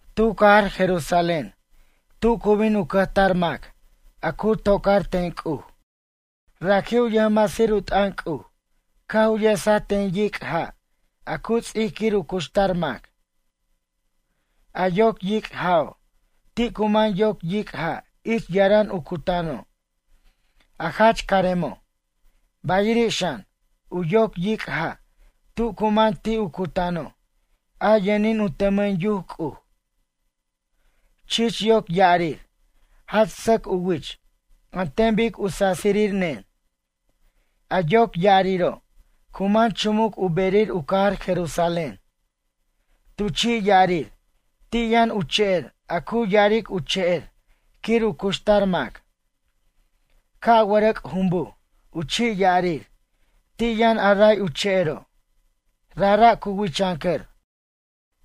Tu cajar Jerusalén tu cu bin u cʌjtar mac a cu tocar ten C'uj. Raji' u yʌjmasir u t'ʌn C'uj caj u yesaj ten yic' ja' a cu ts'ic quir u cuxtar mac. A yoc yic' ja'o', ti' cu man yoc yic' ja' ich yaran u cutano', a jach caremo', bayiri' xan, u yoc yic' ja' tu cu man ti' u cutano', a yʌnin u tʌmʌn yuc C'uj. Chich yoc ya'arir, jach sʌc u wich an ten bic u sasir nen. A yoc ya'ariro', cu man chumuc u berir u cajar Jerusalén. Tu chi' ya'arir ti' yʌn u che'er a cu ya'aric u che'er quir u cuxtar mac. Ca' wʌrʌc' jumbuj u chi' ya'arir ti' yʌn a ray u che'ero'. Rajra' cu wichʌncʌr,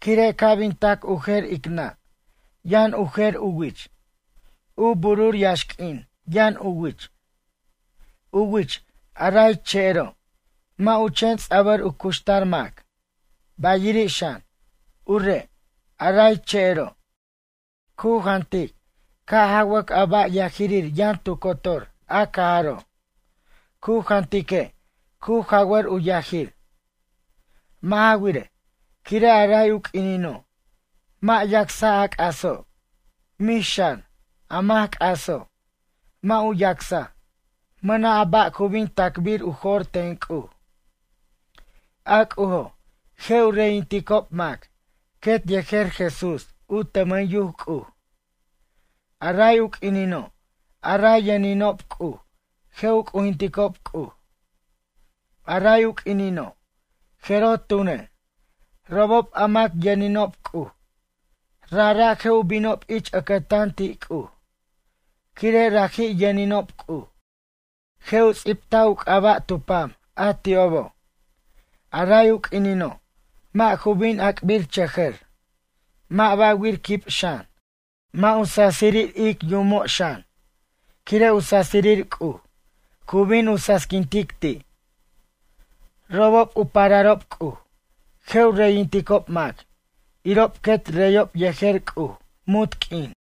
quire' ca' bin tac u jer ic nʌ' yʌn u jer u wich. U burur yax'quin yʌn u wich. U wich, a ray che'ero', mʌ' u chen ts'abʌr u cuxtar mac, bayiri' xan, u re', a ray che'ero', cu jantic ca' jawʌc a ba' yajir yʌn tu cotor a cajaro', cu jantique' cu jawʌr u yajir. Mʌ' ja wirej, quire' a ray u q'uinino', mʌ' yacsa' a c'aso', mix xan, a mac c'aso' mʌ' u yacsa', mʌna' ba' a cu bin tac'bir u jo'r ten C'uj. A C'ujo', je' u reyinticob mac quet yejer Jesús u tʌmʌn yuc C'uj. A ray u q'uinino', a ray yʌninob C'uj je' u c'ujinticob C'uj. A ray u q'uinino', jeroj tune', robob a mac yʌninob C'uj, rajra' je' u binob ich ʌcʌtan ti' C'uj, quire' raji' yʌninob C'uj. Je' u ts'ibtaj u c'aba' tu pam a ti'obo'. A ray u q'uinino', mʌ' ju bin ac'birchʌjʌr, mʌ' ba'wir quib xan, mʌ' u sasirir ic yumo' xan, quire' u sasirir C'uj cu bin u sasiquintic ti'. Robob u pararob C'uj je' u reyinticob mac irob quet reyob yejer C'uj munt q'uin.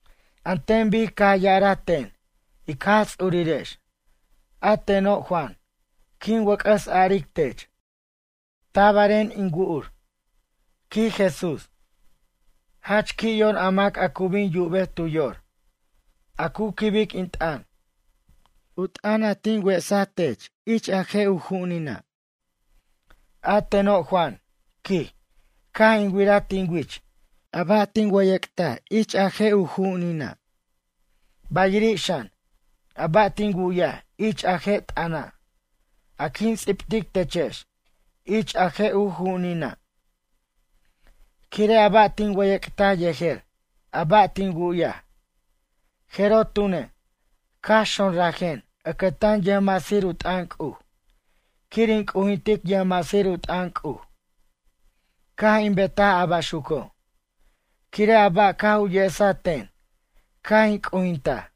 An ten bic caj ya'araj ten ic Jaj Ts'urirex, a teno', Juan, quin wʌc'ʌs aric tech: “Tabaren in wu'ur”, quij Jesús. Jach qui' yor a mac a cu bin yubej tu yor, a cu quibic in t'ʌn, u t'ʌn a tin wesaj tech ich a je' u ju'unina'. A teno' Juan, quij, caj in wiraj tin wich a ba' tin wʌyʌc'taj ich a je' u ju'unina'. Bayiri' xan, a ba' tin wu'yaj ich a je' t'ʌna', a quin ts'ibtic techex ich a je' u ju'unina'. Quire' a ba' tin wʌyʌc'taj yejer a ba' tin wu'yaj, jeroj tune', caj xonrajen ʌcʌtan yʌjmasir u t'ʌn C'uj quir in c'ujintic yʌjmasir u t'ʌn C'uj. Caj in betaj a baxuco', quire' a ba' caj u yesaj ten caj in c'ujintaj.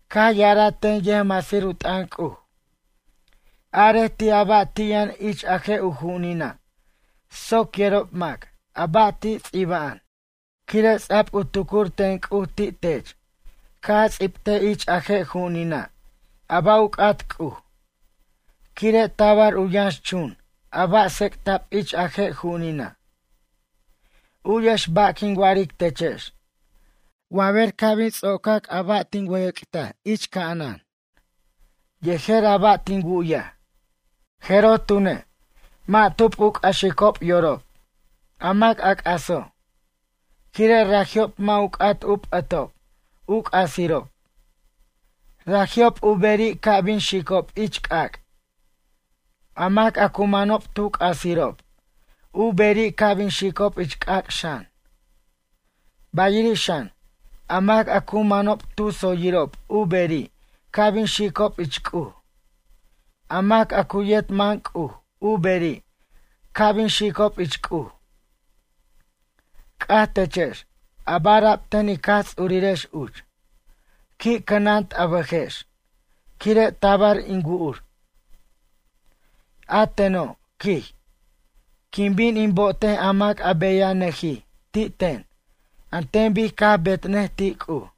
Caj ya'araj ten yʌjmasir u t'ʌn C'uj: ―Arej ti' a ba' ti' yʌn ich a je' u ju'unina' soc yerob mac a ba' ti' ts'iba'an, quire' ts'a'b u tucur ten C'uj ti' tech ca' a ts'ibtej ich a je' ju'unina' a ba' u c'at C'uj. Quire' tabar u yʌnxchun a ba' tsecta'b ich a je' ju'unina'. U'yex ba' quin wa'aric techex. Wa ber ca' bin ts'ocac a ba' tin wʌyʌc'taj ich ca'anan yejer a ba' tin wu'yaj, jeroj tune', mʌ' tub u c'axicob yorob, a mac a c'aso', quire' raji'ob mʌ' u c'at u p'ʌtob u c'asirob, raji'ob u beri' ca' bin xicob ich c'ac'. A mac a cu manob tu c'asirob u beri' ca' bin xicob ich c'ac' xan. Bayiri' xan, a mac a cu manob tu tsoyirob u beri' ca' bin xicob ich C'uj. A mac a cu yet man C'uj u beri' ca' bin xicob ich C'uj. C'aj techex a ba' ara'b ten ic Jaj Ts'urirex uch: ―Qui' cʌnant a bʌjex quire' tabar in wu'ur. A teno' ―quij―, quin bin in bo'otej a mac a beyajnʌjij ti' ten an ten bic caj betnʌj ti' C'uj.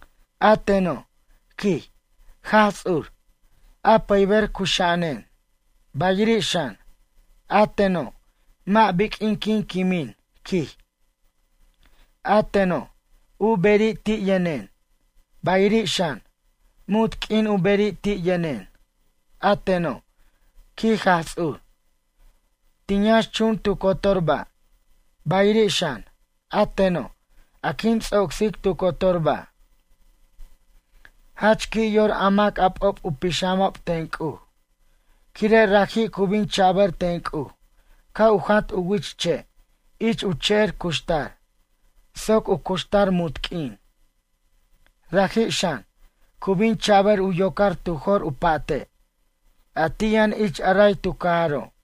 A teno' ―quij― Jaj Ts'ur, a pʌyber cuxa'anen. Bayiri' xan, a teno' mʌ' biq'uin quin quimin ―quij―. A teno', u beri' ti' yʌnen, bayiri' xan, munt q'uin u beri' ti' yʌnen. A teno' ―quij Jaj Ts'ur―, tin yʌnxchun tu cotor ba', bayiri' xan, a teno' a quin ts'ocsic tu cotor ba'. Jach qui' yor a mac a p'ob u pixamob ten C'uj, quire' raji' cu bin cha'bʌr ten C'uj ca' u jant u wich che' ich u che'er cuxtar soc u cuxtar munt q'uin, raji' xan, cu bin cha'bʌr u yocar tu jor u pa'te', a ti' yʌn ich a ray tu cajaro'.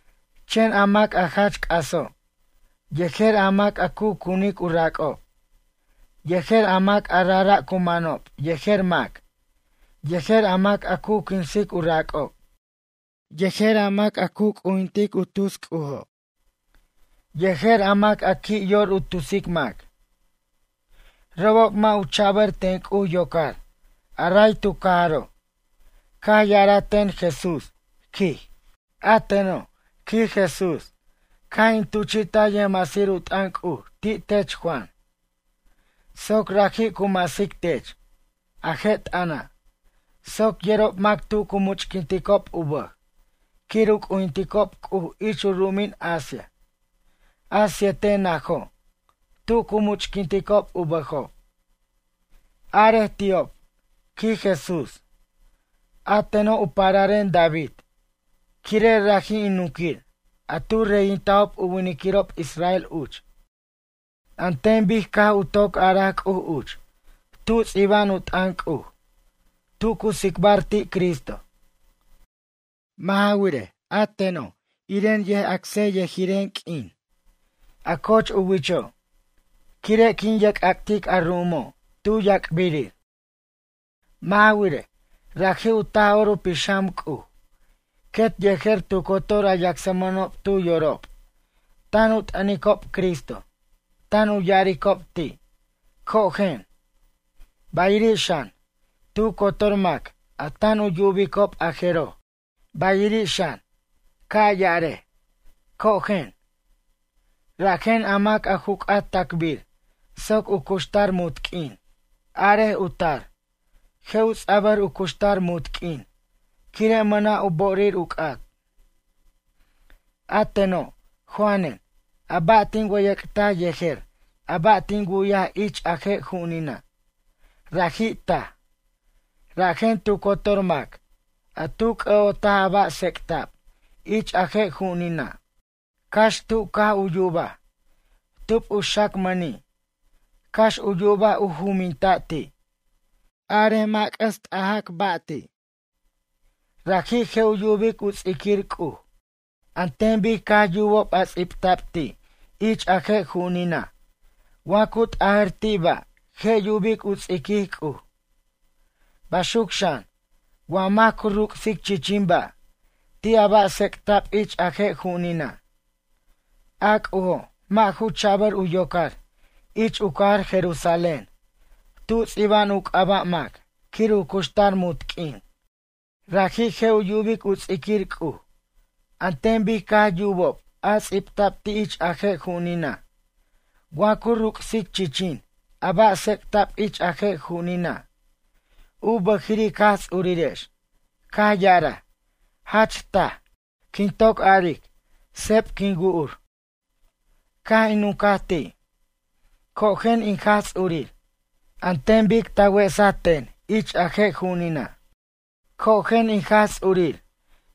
Chen a mac a jach c'aso', yejer a mac a cu cunic u rac'ob, yejer a mac a rajra' cu manob yejer mac, yejer a mac a cu quinsic u rac'ob, yejer a mac a cu c'ujintic u tus c'ujo', yejer a mac a qui' yor u tusic mac, robob mʌ' u cha'bʌr ten C'uj yocar a ray tu cajaro'. Caj ya'araj ten Jesús, quij: ―A teno' ―quij Jesús―, caj in tuchi'taj yʌjmasir u t'ʌn C'uj ti' tech Juan, soc raji' cu masic tech, a je' t'ʌna', soc yerob mac tu cu much'quinticob u bʌj quir u c'ujinticob C'uj ich u ru'umin Asia, a siete najo', tu cu much'quinticob u bʌjob. Arej ti'ob ―quij Jesús―, a teno', u pararen David quire' raji' in nunquir a tu reyintajob u winiquirob israel uch, an ten bic caj toc araj C'uj uch tu ts'iba'an u t'ʌn C'uj, tu cu tsicbar ti' Cristo. Mʌ' ja wirej, a teno', iren yʌjyacsiryʌjiren q'uin, a coch u wicho', quire' quin yerc'ac'tic a ru'umo' tu yac'birir. Mʌ' ja wirej, raji' u Taj'or u Pixam C'uj quet yejer tu cotor a yacsmʌnob tu yorob tan u t'ʌnicob Cristo tan ya'aricob ti': ―Cojen. Bayiri' xan, tu cotor mac a tan u yubicob a jeroj, bayiri' xan, ca' ya'arej: ―Cojen. Rajen a mac a ju c'at tacbir soc u cuxtar munt q'uin, arej u tar, je' u ts'abʌr u cuxtar munt q'uin quire' mʌna' u bo'orir u c'at. A teno', Juanen, a ba' tin wʌyʌc'taj yejer a ba' tin wu'yaj ich a je' ju'unina', raji' taj. Rajen tu cotor mac a tu c'ʌ'otaj a ba' tsec'ta'b ich a je' ju'unina', cax tu caj u yubaj, tub u xacmʌni', cax u yubaj u juminta' ti'. Arej mʌ' u c'ʌs t'ajac ba' ti'. Raji' je' u yubic u ts'iquir C'uj an ten bic caj yubob a ts'ibta'b ti' ich a je' ju'unina' wa cu t'ajar ti' ba' je' yubic u ts'iquij C'uj. Baxuc xan, wa mac cu ruc'sic chichin ba' ti' a ba' tsec'ta'b ich a je' ju'unina', a C'ujo' mʌ' ju cha'bʌr u yocar ich u cajar Jerusalén tu ts'iba'an u c'aba' mac quir u cuxtar munt q'uin. Raji' je' u yubic u ts'iquir C'uj, an ten bic caj yubob a ts'ibta'b ti' ich a je' ju'unina' wa cu ruc'sic chichin a ba' tsec'ta'b ich a je' ju'unina'. U bʌjiri' ic Jaj Ts'urirex caj ya'araj: ―Jach taj, quin toc aric, seb quin wu'ur. Caj in nuncaj ti': ―Cojen in Jaj Ts'urir, an ten bic ta wesaj ten ich a je' ju'unina'. Cojen in Jaj Ts'urir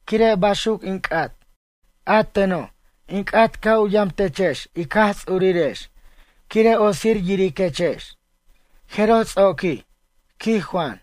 quire' baxuc in c'at. A teno', in c'at ca' u yamtechex ic Jaj Ts'urirex quire' otsir yiriquechex. Jeroj ts'oquij, quij Juan.